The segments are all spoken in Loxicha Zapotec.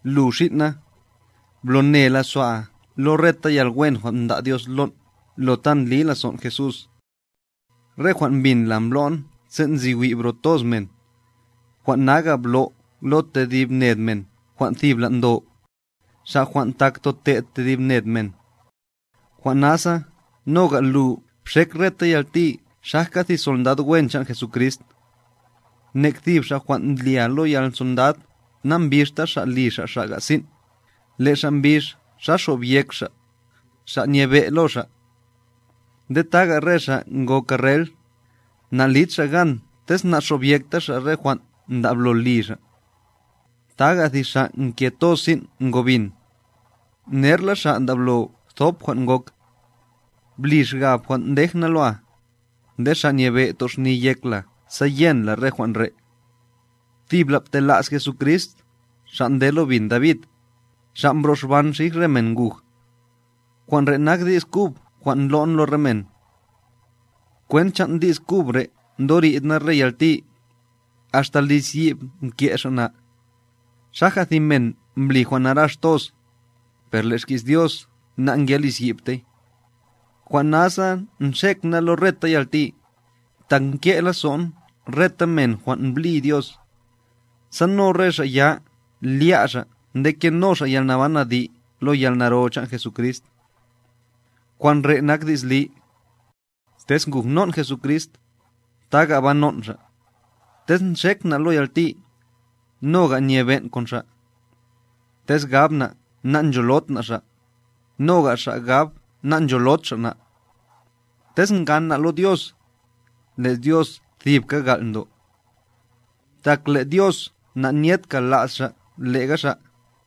Lu xin' na, blo ne lazo'a lo reta yalwen jwan' mda' Dios lon' lo ta ndli lazon' Jesús. Re jwan' mbin la mblo'n sen' nzi wi' bro toz men, jwan' naga' blo' lo tedib ned men jwan' thibla ndo, xa' jwan' tak tote'd tedib ned men. Jwan' nasa noga' lu bxek reta yalti xajka thi sondad wen chan' Jesucrist. Nekthib xa' jwan' ndlya lo yalsondad nambixta xa' li xa' xaga' sin', le' xa' mbix xa xobyek xa', xa' nyebe' lo xa'. Nde taga' re xa' ngo karrel, nalid xa' gan tez nanxobyekta xa' re jwan' ndablo li xa'. Taga' thi xa' nke toz sin' ngo bin, nerla xa' ndablo thop jwan' ngok. Bli xgab jwan' ndej na loa, nde Xa' Nyebe' toxni yek la sa yen la re jwan' re'. Thibla btela's Jesucrist, Xa' nde lo bin David, Xa' mbro'xban xij re men nguj. Jwan' re' nak di's kub jwan' ndlo'n lo re men. Kwent chan' di's kub re' ndori'd na re yalti, axta lizyi'b mke' xa' na, xaja' thi men mbli jwan' narax toz, per le' xki's Dios nangelizyi'btey. Jwan' nasa nxek na lo reta yalti, tak nke' lazo'n reta men jwan' mblí Dios, sa no re xa' ya lya' xa' nde keno xa' yalnaban adi' lo yalnaro chan' Jesucrist. Jwan' re nak di's li: Tez ngujnon' Jesucrist, taga' banon' Xa'; Tez nxek na' lo yalti, noga' nyebe'n kon Xa'. Tez gab na' nancholod na' Xa', noga' Xa' gab nancholod Xa' na'. Tez ngan na' lo Dios, le' Dios thibka gal' ndo. Tak le' Dios na'nyed kala's Xa' le'ga Xa'.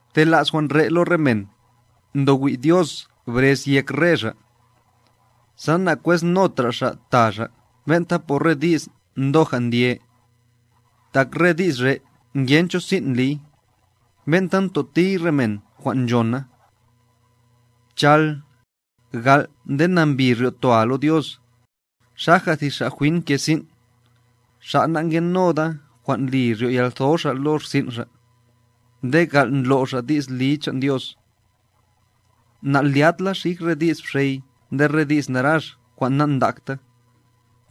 Btela's jwan' re' lo re men, ndo wi' Dios brez yek re xa', sa na'kweznotra xa' ta xa' ben'ta por re di's ndoja' ndye. Tak re di's re' ngencho sin' ndliy, ben'ta ntotiy re men jwan' nchona. Bchal, gal' nde nambi ryo'toa lo Dios, xaja thi xa' jwin nke sin', xa' nangenoda jwan' li ryo'yantho xa' lo rsin' xa', nde gal' ndlo' xa' di's li chan' Dios. Na'lyat la xij re di's bxey nde re di's narax jwan' nandakta,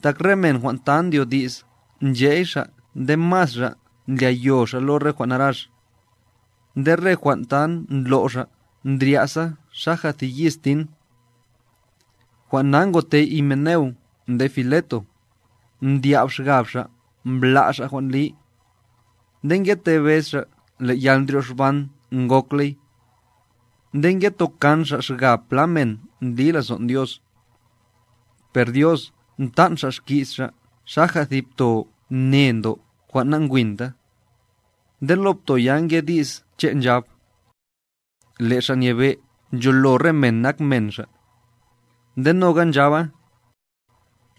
tak re men jwan' ta ndyodi's nche'y xa' nde masra' ndlyayo xa' lo re jwan' narax, nde re jwan' ta ndlo' xa' ndrya'sa xaja thi yis tin. Jwan' na ngote Himeneo nde Fileto, mdya'b xgab xa' mbla' xa' jwan' li, nde ngetebez xa' le' yalndryoxban ngokley, nde ngetokan xa' xgab pla men ndli lazo'n Dios. Per Dios mtan' Xa' xki's Xa' xaja thi pto ne ndo jwan' nangwinta, nde lo pto ya nge di's che' nchab: “Le' Xa' Nyebe ncholo re men nak men Xa'”; nde noga nchaba: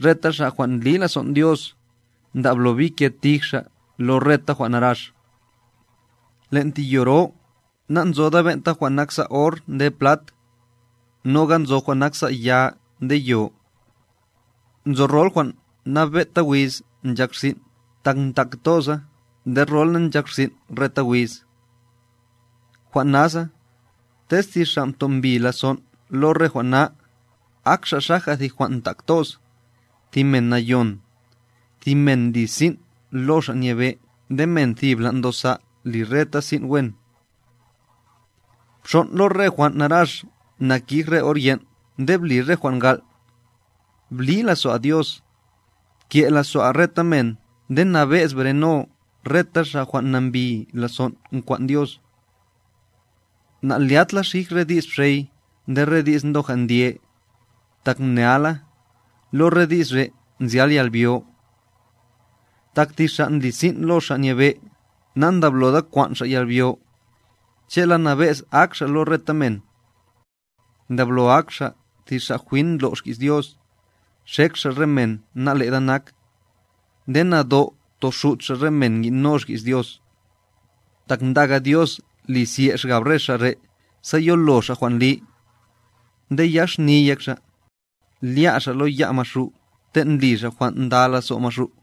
“Reta xa' jwan' ndli lazon' Dios, ndablo bike tij xa' lo reta jwan' narax.” Len' thi yo ro nanzoda ben'ta jwan' naksa' or nde plat, noga nzo jwan' naksa' ya nde yo. Nzo rol jwan' nabe'ta wiz nchak rsin' tak ntak toza nde rola nchak rsin' reta wiz. Jwan' nasa, tez thi xa' mtombi lazon' lo re jwan' na, ak xa' xaja thi jwan' ntak toz, thi men nayon, thi men ndli sin' lo Xa' Nyebe' nde men thibla ndosa' li reta sin' wen. Bxon' lo re jwan' narax nakij re or yen' nde bli re jwan' gal', bli lazo'a Dios, bke' lazo'a reta men nde nabe'z breno reta xa' jwan' nambi lazon' nkwan' Dios. Nalyat la xij re di's bxey nde re di's ndoja' ndye, tak mnea la, lo re di's re' nzyal yalbyo. Tak thi xa' ndli sin' lo Xa' Nyebe' na'nda'bloda kwan' xa' yalbyo, che'la nabe'z ak xa' lo reta men. Ndablo ak xa' thi xa' jwin ndlo' xki's Dios, xek xa' re men na'leda nak, nde nado' toxut xa' re men ngi'no xki's Dios, tak ndaga Dios li zye' xgab re xa' re' sa yolo xa' jwan' li, nde yax xni yek xa', lya' xa' lo ya' Maxu' ten' ndli xa' jwan' nda lazo' Maxu'.